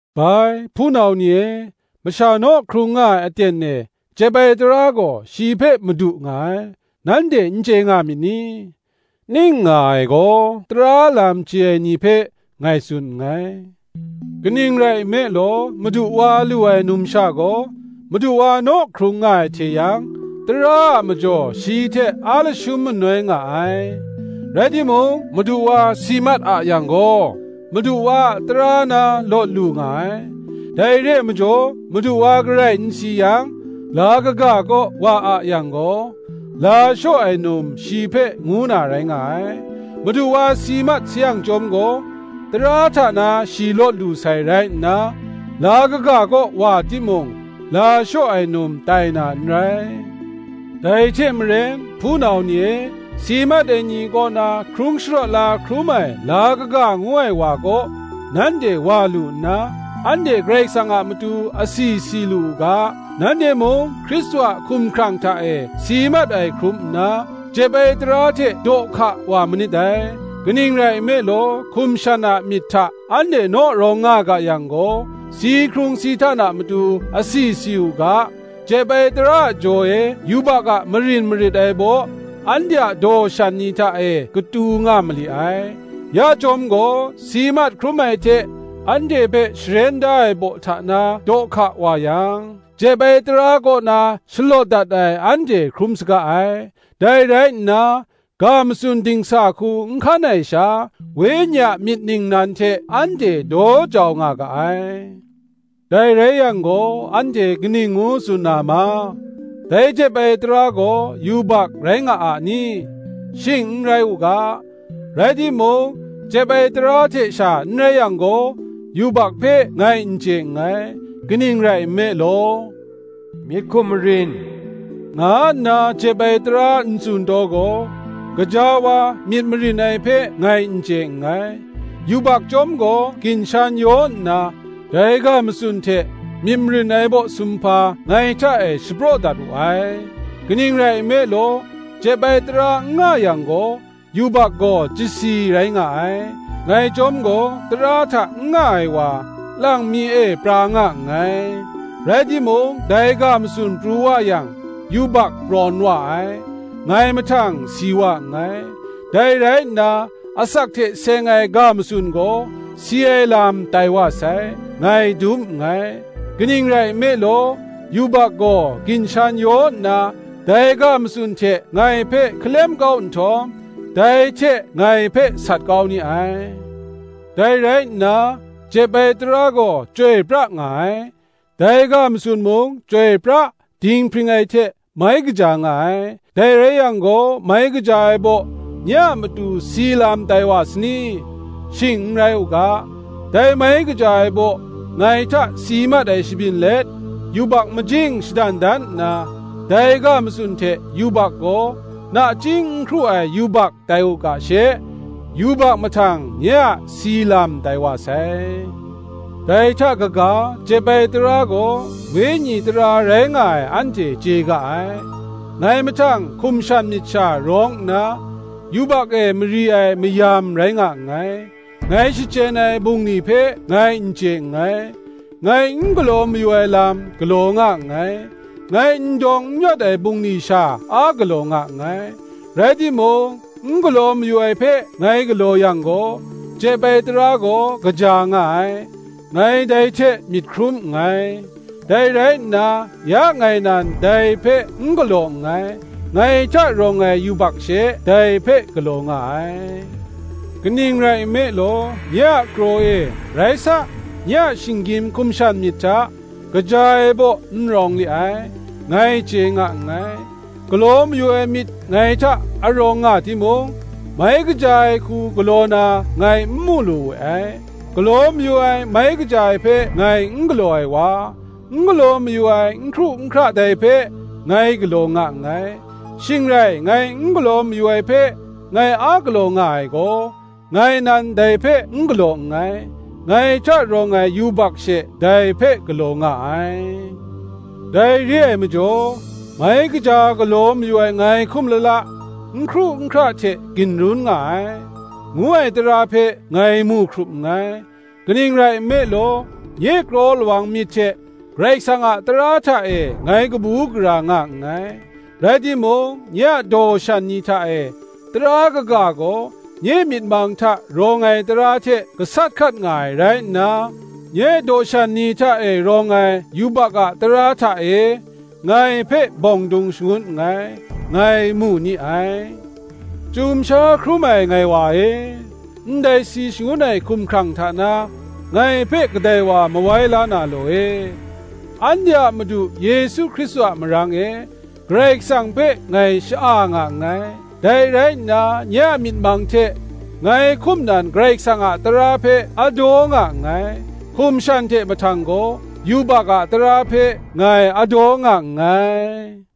Bai, hpunau ni e, masha naw hkrung nga ai aten e, jep ai tara gaw shi hpe madu nga ai, nanhte n chye nga myit ni? (ning nga ai gaw, tara lam chye ai ni hpe ngai tsun nngai). Kaning rai nme law, madu wa lu ai numsha gaw, madu wa naw hkrung nga ai hte yang, tara a majaw shi hte a lashum manoi nga ai: rai timung, madu wa si mat a yang gaw, madu wa a tara na lawt lu nga ai. Dai re ai majaw, madu wa garai n si yang, la kaga kaw wa a yang gaw, la shaw ai num shi hpe ngu na rai nga ai; madu wa si mat sayang chyawm gaw, tara hta na shi lawt lu sai rai nna, la kaga kaw wa timung, la shaw ai num tai na n rai. Dai hte maren, hpunau ni e, si mat ai ni kaw na hkrung sharawt la hkrum ai la kaga ngu ai wa kaw, nanhte wa lu nna, anhte Karai Kasang a matu asi si lu u ga, nanhte mung Hkristu a hkumhkrang hta e si mat ai hkrum nna, jep ai tara hte daw hka wa manit dai. Kaning rai nme law, hkum shan a myit hta anhte naw rawng nga ga yang gaw, si hkrung si htan a matu asi si u ga, jep ai tara a jaw e yubak a marin marit ai baw, anhte a daw shan ni hta e katu nga mali ai. Ya chyawm gaw, si mat hkrum ai hte anhte hpe sharen da ai baw hta na daw hka wa yang, jep ai tara kaw na shalawt dat ai anhte hkrum saga ai: dai rai nna, ga matsun dingsa hku n hkan ai sha, Wenyi a myit ningnan hte anhte daw jau nga ga ai. Dai rai yang gaw, anhte kaning ngu tsun na ma? Dai jep ai tara gaw yubak rai nga n ni? Shing n rai u ga. Rai timung, jep ai tara hte sha n rai yang gaw, yubak hpe ngai n chye nngai: kaning rai nme law, Myit hkum marin, nga nna jep ai tara n tsun taw gaw, gaja wa, myit marin ai hpe ngai n chye nngai. Yubak chyawm gaw ginshan yaw nna, dai ga matsun hte myit marin ai baw sumhpa ngai hta e shapraw dat wu ai; kaning rai nme law, jep ai tara n nga yang gaw, yubak gaw chyasi rai nga ai. Ngai chyawm gaw tara hta n nga ai wa, lang mi e pra nga nngai: rai timung dai ga matsun pru wa yang, yubak prawn wa ai, ngai mahtang si wa nngai; dai rai nna, asak hte seng ai ga matsun gaw, si ai lam tai wa sai, ngai dum nngai: kaning rai nme law, yubak gaw ginshan yaw nna, dai ga matsun hte ngai hpe hkalem kau nhtawm, dai hte ngai hpe sat kau ni ai. Dai rai nna, jep ai tara gaw chyoi pra nga ai; dai ga matsun mung, chyoi pra, dinghpring ai hte mai kaja nga ai. Dai rai yang gaw, mai kaja ai baw nye a matu si lam tai wa sani? Shing n rai u ga. Dai mai kaja ai baw ngai hta si mat ai shabyin let, yubak majing shadan dan nna, dai ga matsun hte yubak gaw nachying n hkru ai yubak tai u ga she, yubak mahtang nye a si lam tai wa sai. Dai hta kaga, jep ai tara gaw wenyi tara rai nga ai anhte chye ga ai; ngai mahtang hkum shan myit sha rawng nna, yubak e mari ai mayam rai nga nngai. Ngai shachyen ai bungli hpe ngai n chye nngai; ngai n galaw mayu ai lam galaw nga nngai; ngai n dawng n yawt ai bungli sha a galaw nga nngai. Rai timung, n galaw mayu ai hpe ngai galaw yang gaw, jep ai tara gaw kaja nga ai, ngai dai hte myit hkrum nngai. Dai rai nna, ya ngai nan dai hpe n galaw nngai, ngai hta rawng ai yubak she dai hpe galaw nga ai. Kaning rai nme law, nye a kraw e, rai sa, nye a shinggyim hkum shan myit hta, kaja ai baw n rawng li ai, ngai chye nga nngai: galaw mayu ai myit ngai hta a rawng nga timung, mai kaja ai hku galaw na ngai n mu lu we ai. Galaw mayu ai mai kaja ai hpe ngai n galaw ai wa, n galaw mayu ai n hkru n hkra dai hpe ngai galaw nga nngai. Shing rai ngai n galaw mayu ai hpe ngai a galaw nga ai gaw, ngai nan dai hpe n galaw nngai, ngai hta rawng ai yubak she dai hpe galaw nga ai. Dai re ai majaw, mai kaja galaw mayu ai ngai hkum lala, n hkru n hkra hte ginrun nga ai, ngu ai tara hpe ngai mu hkrup nngai. Kaning rai nme law, nye kraw lawang myit hte Karai Kasang a tara hta e ngai kabu gara nga nngai; rai timung, nye a daw shan ni hta e tara kaga gaw, nye myit mang hta rawng ai tara hte gasat hkat nga ai rai nna, nye daw shan ni hta e rawng ai yubak a tara hta e ngai hpe bawng dung shangun nngai, ngai mu ni ai. Chyum sha hkrum ai ngai wa e, ndai si shangun ai hkumhkrang hta na, ngai hpe kadai wa mawai la na law e? Anhte a Madu Yesu Hkristu a marang e, Karai Kasang hpe ngai sha-a nga nngai. Dai rai nna nye a myit mang hte ngai hkum nan Karai Kasang a tara hpe a daw nga nngai; hkum shan hte mahtang gaw yubak a tara hpe ngai a daw nga nngai.